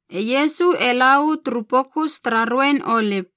E Iesu e la uu turu Pokus tara Ruein Olip.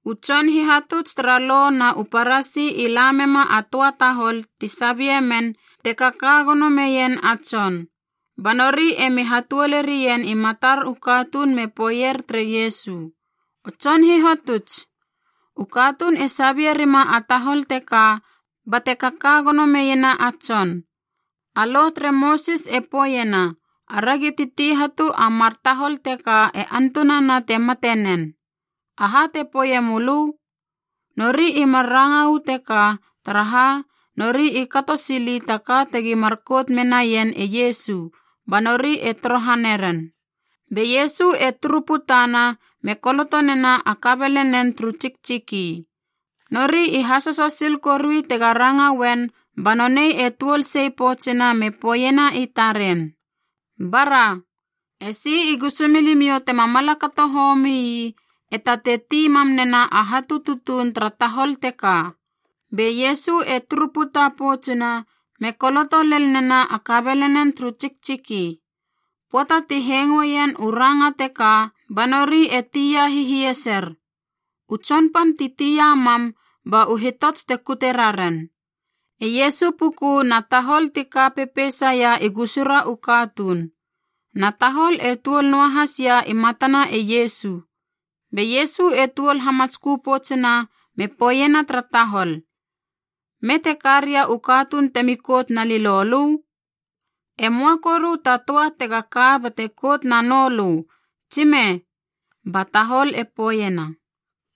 U tson hihatuts tara Lo na u Parasi i lamema a töa tahol ti sabie men te kaka gono meien a tson.a Ba nori emi hatuolerien i matar u katuun me poeier tere Iesu, “O Tson Hihatuts, u katuun e sabie rima a tahol teka bate kaka gono meiena a tson. A Lo tere Mosis e poeiena aragi titi hatu a mar tahol teka e antunana te mate nen. Aha te poeie mölö?” Nori i mar ranga uu teka taraha, nori i kato sili ta ka tegi mar kout menaien e Iesu, ba nori e torohaneren. Be Iesu e turu putana me koloto nena a kabelenen turu tsiktsiki. Nori i hasoso sil korui tega ranga uen ba nonei e tuol sei poutsuna me poeiena i taren, “Bara, esi i gusumilimiou tema mala kato homii e tatei ti mam nena a hatu tutuun tara tahol teka.” Be Iesu e turu puta poutsuna me koloto lel nena a kabelenen turu tsiktsiki. Pöata ti hengoeien u ranga teka ba nori e tia hihieser, u tson pan ti tia mam ba u hitots e kute raren. E Iesu puku na tahol ti ka pepeisaia u gusura u katuun, na tahol e tuol noahas ia i matana e Iesu. Be Iesu e tuol hamatskö poutsuna me poeiena tara tahol, “Me te ka ria u katuun temi kout na lilolö? E möa koru ta töa tega ka bate kout nanölö, tsime?” Ba tahol e poeiena,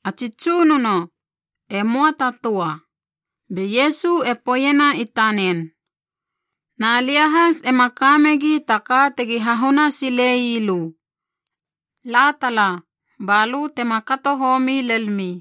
“A tsi Tsunono, e möa ta töa.” Be Iesu e poeiena i tanen, “Na lia has ema ka megi ta ka tegi hahune silei lö. La tala, ba lö tema kato homi lelmi.”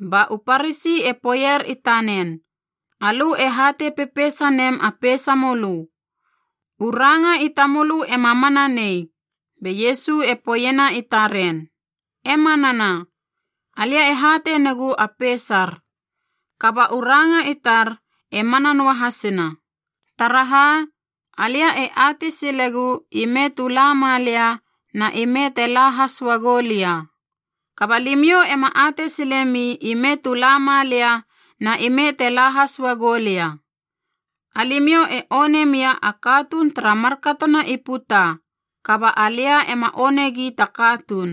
Ba u Parasi e poeier i tanen, “Alö e hatei pepeisa nem a peisamölö. U ranga i tamölö ema mana nei.” Be Iesu e poeiena i taren, “E manana, alia e hatei negu a peisar. Kaba u ranga i tar e mana noa hasina. Taraha, alia e atei silegu ime tu la malia na ime te la has uagou lia. Kaba limiou ema atei silemi ime tu la malia na ime te la has uagou lia. Alimiou e one mia a katuun tara markatona i puta, kaba alia ema onegi ta katuun.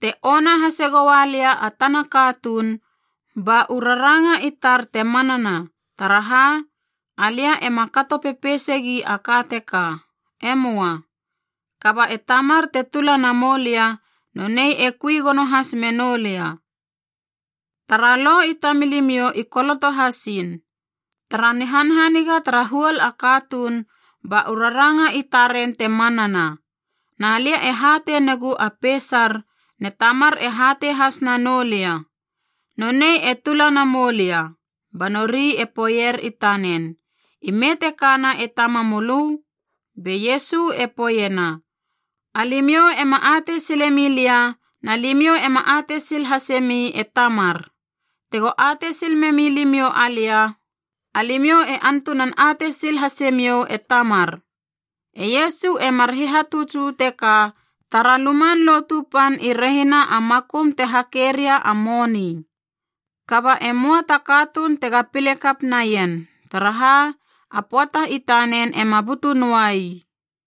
Te ona hase goua lia a tana katuun, ba u raranga i tar te manana taraha, alia ema kato pepeisegi a ka teka. E möa. Kaba e Tamar te tula na moulia, nonei e kui gono has menou lia. Tara Lo i tamilimiou i koloto hasiin, tara nihanhaniga tara huol a katuun, ba u raranga i taren te manana. Na lia e hatei negu a peisar ne Tamar e hatei has nanou lia. Nonei te tula na moulia.” Ba nori e poeier i tanen, “Ime te kana e tamamölö?” Be Iesu e poeiena, “Alimiou ema atei sile milia na limiou ema atei sil hasemi e Tamar. Tego atei sil memi limiou alia, alimiou e antunan atei sil hasemiou e Tamar.” E Iesu e mar hihatuts uu teka tara Luman Lotu Pan i rehina a makum te hakeria a moni. Kaba e möa ta katuun tega pile kap naien, taraha a pöata i tanen ema butu noua ii.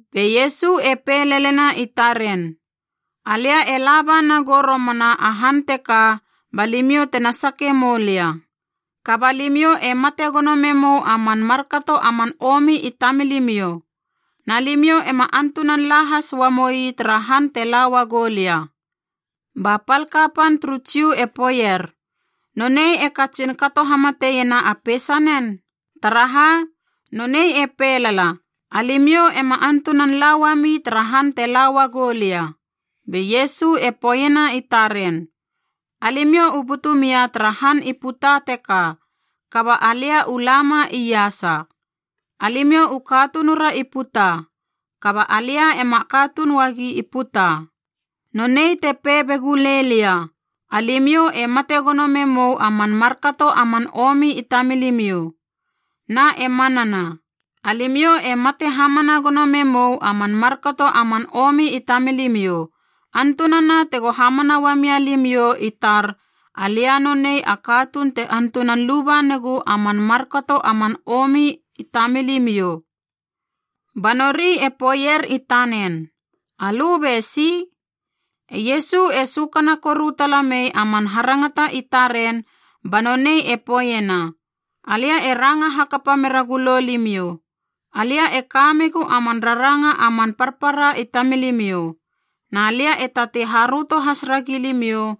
Be Iesu e pei lelena i taren, “Alia e laba nagou romana a han teka ba limiou tena sake moulia. Kaba limiou e mate gono memou a man markato a man omi i tamilimiou. Na limiou ema antunan la has uamoi tara han te la uagou lia.” Ba pal kapan turu Jiu e poeier, “Nonei e katsin kato hamatiena a peisanen? Taraha, nonei e pei lala, ‘Alimiou ema antunan la uami tara han te la uagou lia.’” Be Iesu e poeiena i taren, “Alimiou u butu mia tara han i puta teka, kaba alia u lama iasa. Alimiou u katunura i puta, kaba alia ema katuun uagi i puta. Nonei te pei be gulei lia, alimiou e mate gono memou a man markato a man omi i tamilimiou. Na e manana, alimiou e mate hamana gono memou a man markato a man omi i tamilimiou, antunana tego hamana uamia limiou i tar alia nonei a katuun te antunan luba negu a man markato a man omi i tamilimiou.” Ba nori e poeier i tanen, “Alö be si?” E Iesu e sökana koru tala mei a man harangata i taren ba nonei e poeiena, “Alia e ranga hakapa mera gulo limiou. Alia e kamegu a man raranga a man parpara i tamilimiou, na lia e tatei haröto has ragi limiou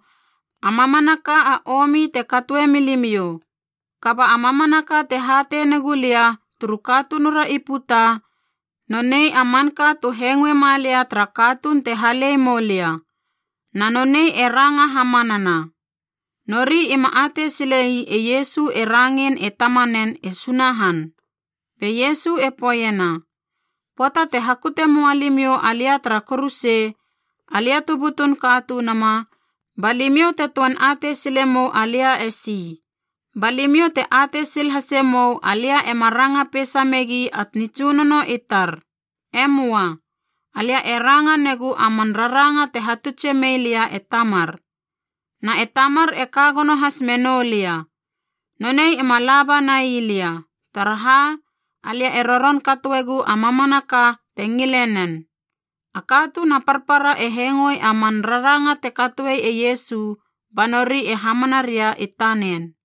a mamanaka a omi te katoe milimiou. Kaba a mamanaka te hatei negu lia turu katunura i puta nonei a manka tu hengoe malia tara katuun te halei moulia, na nonei e ranga hamanana.” Nori ima atei sile ii e Iesu e rangein e Tamanen e Sunahan. Be Iesu e poeiena, “Pöata te hakute moa limiou alia tara kuruse, Alia tu butun Katunuma, ba limiou te töan atei sile mou alia esi. Ba limiou te atei sil hase mou alia ema ranga peisa megi a nitsunono i tar. E möa. Alia e ranga negu a man raranga te hatutse mei lia e Tamar. Na e Tamar e ka gono has menou lia. Nonei ema laba nai lia, taraha alia e roron katoegu a mamanaka te ngile nen.” A katuun a parpara e hengoe a man raranga te katoe e Iesu ba nori e hamana ria i tanen.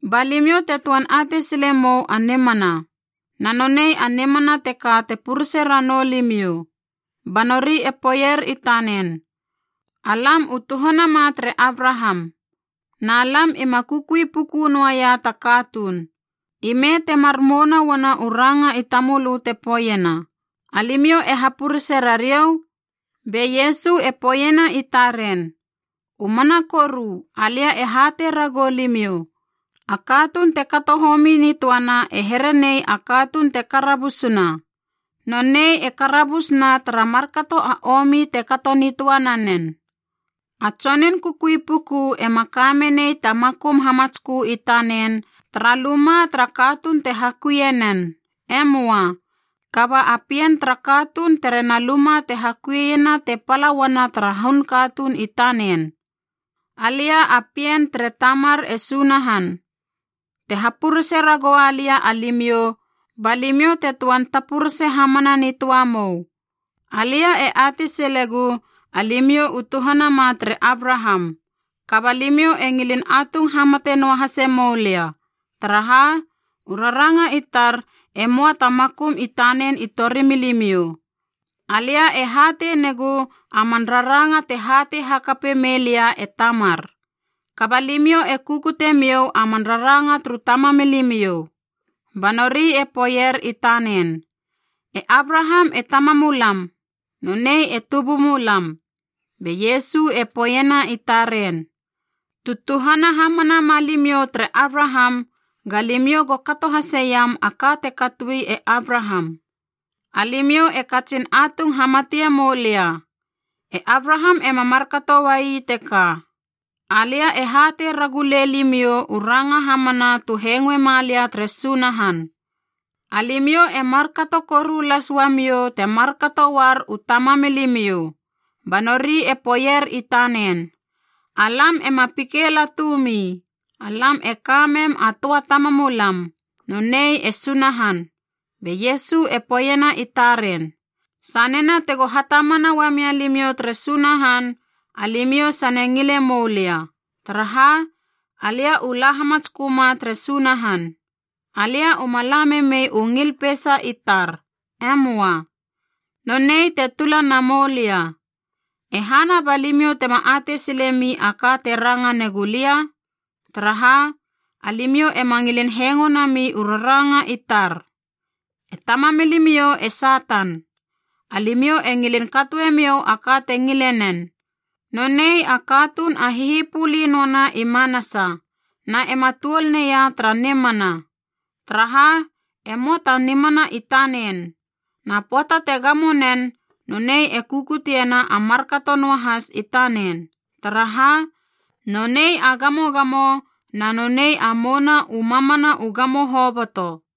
Ba limiou te töan atei sile mou a nimana, na nonei a nimana teka te purese ranou limiou.” Ba nori e poeier i tanen, “Alam u tuhanama tere Abraham. Na lam ima kukui puku noia ta katuun. I me temar mouna uana u ranga i tamölö te poeiena, ‘Alimiou e hapurese rariou’?” Be Iesu e poeiena i taren, “U mana koru alia e hatei ragou limiou, a katuun te kato homi nitöana e herenei a katuun te karabusuna. Nonei e karabus na tara markato a omi te kato nitöa nanen. A tsonun kukui puku ema ka menei ta makum hamatskö i tanen tara luma tara katuun te hakuie nen, e möa, kaba a pien tara katuun terena luma te hakuina te pala uana tara hun katuun i tanen. Alia a pien tere Tamar e Sunahan. Te hapurese ragoua lia alimiou, ba limiou te töan tapurese hamana nitöa mou. Alia e atei silegu alimiou u tuhanama tere Abraham. Kaba limiou e ngilin atung hamate noahase moulia, taraha u raranga i tar emoa ta makum i tanen i torimilimiou. Alia e hatei negu a man raranga te hatei hakape melia e Tamar. Kaba limiou e kukute miou a man raranga turu tamamilimiou.” Ba nori e poeier i tanen, “E Abraham e tamamulam, nonei e tubumulam.” Be Iesu e poeiena i taren, “Tu tuhana hamana ma limiou tere Abraham, ga limiou go kato haseiam a ka te katoi e Abraham. Alimiou e katsin atung hamatie moulia. E Abraham ema markato uai teka. Alia e hatei ragu lei limiou u ranga hamana tu hengoe malia tere Sunahan. Alimiou e markato koru las uamiou te markato uar u tamamilimiou.” Ba nori e poeier i tanen, “Alam ema pikeilatu mi. Alam e ka mem a töa tamamulam, nonei e Sunahan.” Be Iesu e poeiena i taren, “Sanena tego hatamana uamia limiou tere Sunahan, alimiou sane ngile moulia, taraha alia u la hamatsköma tere Sunahan. Alia uma la memei u ngil peisa i tar. E möa. Nonei te tula na moulia. E hana ba limiou tema atei silemi a ka te ranga negu lia? Taraha, alimiou ema ngilin hengo nami u raranga i tar. E tamamilimiou e Satan, alimiou e ngilin katoemiou a ka te ngile nen. Nonei a katunun a hihipuli noana i manasa, na ema tuol neia tara nimana, taraha e moa ta nimana i tanen. Na pöata te gamo nen, nonei e kukutiena a markato noahas i tanen, taraha nonei a gamogamo na nonei a mouna u mamana u gamo hoboto.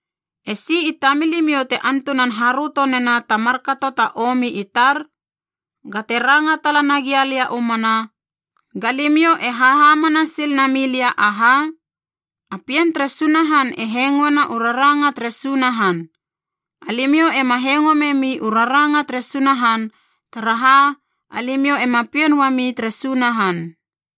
E si i tamilimiou te antunan haröto nena ta markato ta omi i tar? Ga te ranga tala nagia lia u mana, ga limiou e hahamana sil na milia aha? A pien tere Sunahan e hengoena u raranga tere Sunahan. Alimiou ema hengo memi u raranga tere Sunahan, taraha alimiou ema pien uami tere Sunahan.”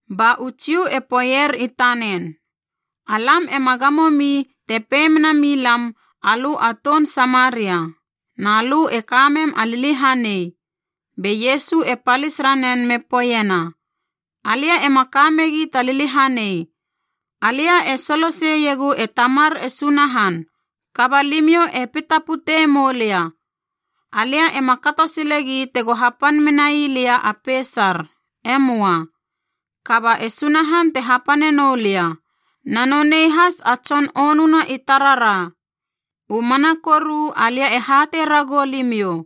Ba u Jiu e poeier i tanen, “Alam ema gamo mi te pei mena milam alö a toun Samaria, na lö e kamem a liliahanei!” Be Iesu e palis ranen me poeiena, “Alia ema ka megi ta liliahanei. Alia e solo seiegu e Tamar e Sunahan, kaba limiou e pitapute moulia. Alia ema kato silegi tego hapan menai lia a peisar. E möa. Kaba e Sunahan te hapane noulia, na nonei has a tson onuna i tarara. U mana koru alia e hatei ragou limiou,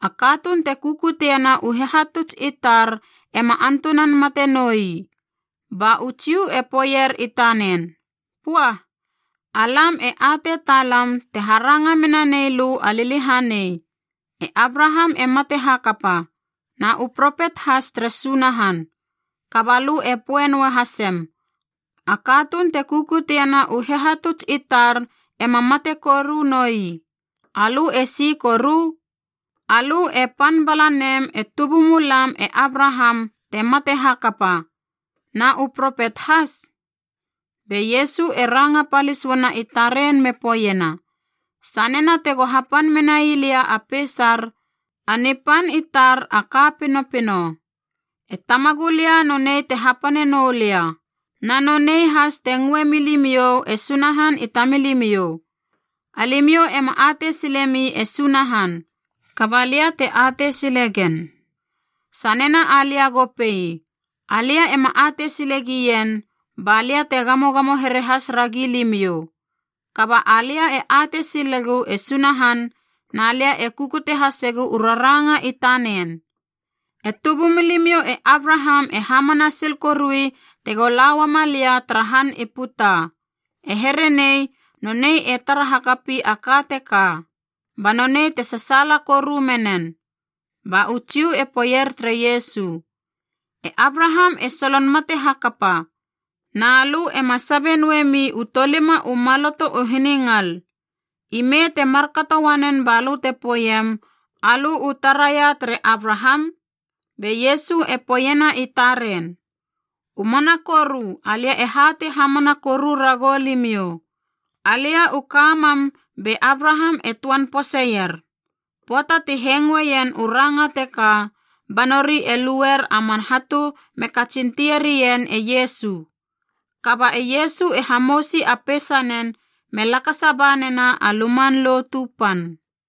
a katuun te kukutiena u hihatuts i tar ema antunan mate noi!” Ba u Jiu e poeier i tanen, “Pua! Alam e atei talam te haranga mena nei lö a liliahanei! E Abraham e mate hakapa, na u propet has tere Sunahan. Kaba lö e poe noa hasem, ‘A katuun te kukutiena u hihatuts i tar ema mate koru noi.’ Alö e si koru? Alö e pan bala nem e tubumulam e Abraham te mate hakapa, na u propet has?” Be Iesu e ranga palis uana i taren me poeiena, “Sanena tego hapan menai lia a peisar, a nipan i tar a ka pinopino. E Tamagulia nonei te hapane noulia, na nonei has te ngöe milimiou e Sunahan i tamilimiou. Alimiou ema atei silemi e Sunahan, kaba lia te atei sile gen. Sanena alia go pei, ‘Alia ema atei sile gien,’ ba lia te gamogamo here has ragi limiou. Kaba alia e atei silegu e Sunahan na lia e kukute hasegu u raranga i tanen. E tubumilimiou e Abraham e hamana sil korui tego la uama lia tara han i puta. E here nei nonei e tara hakapi a ka teka, ba nonei te sasaala koru menen.” Ba u Jiu e poeier tere Iesu, “E Abraham e solon mate hakapa, na lö ema sabe noemi u tolima u maloto u hiningal. Imei te markato uanen balö te poeiem alö u taraia tere Abraham?” Be Iesu e poeiena i taren, “U mana koru alia e hatei hamana koru ragou limiou, alia u ka mam be Abraham e töan poseier.” Pöata ti hengoeien u ranga teka ba nori e lueier a man hatu me katsin tieri ien e Iesu. Kaba e Iesu e hamousi a peisanen me lakasa ba nena a Luman Lotu Pan.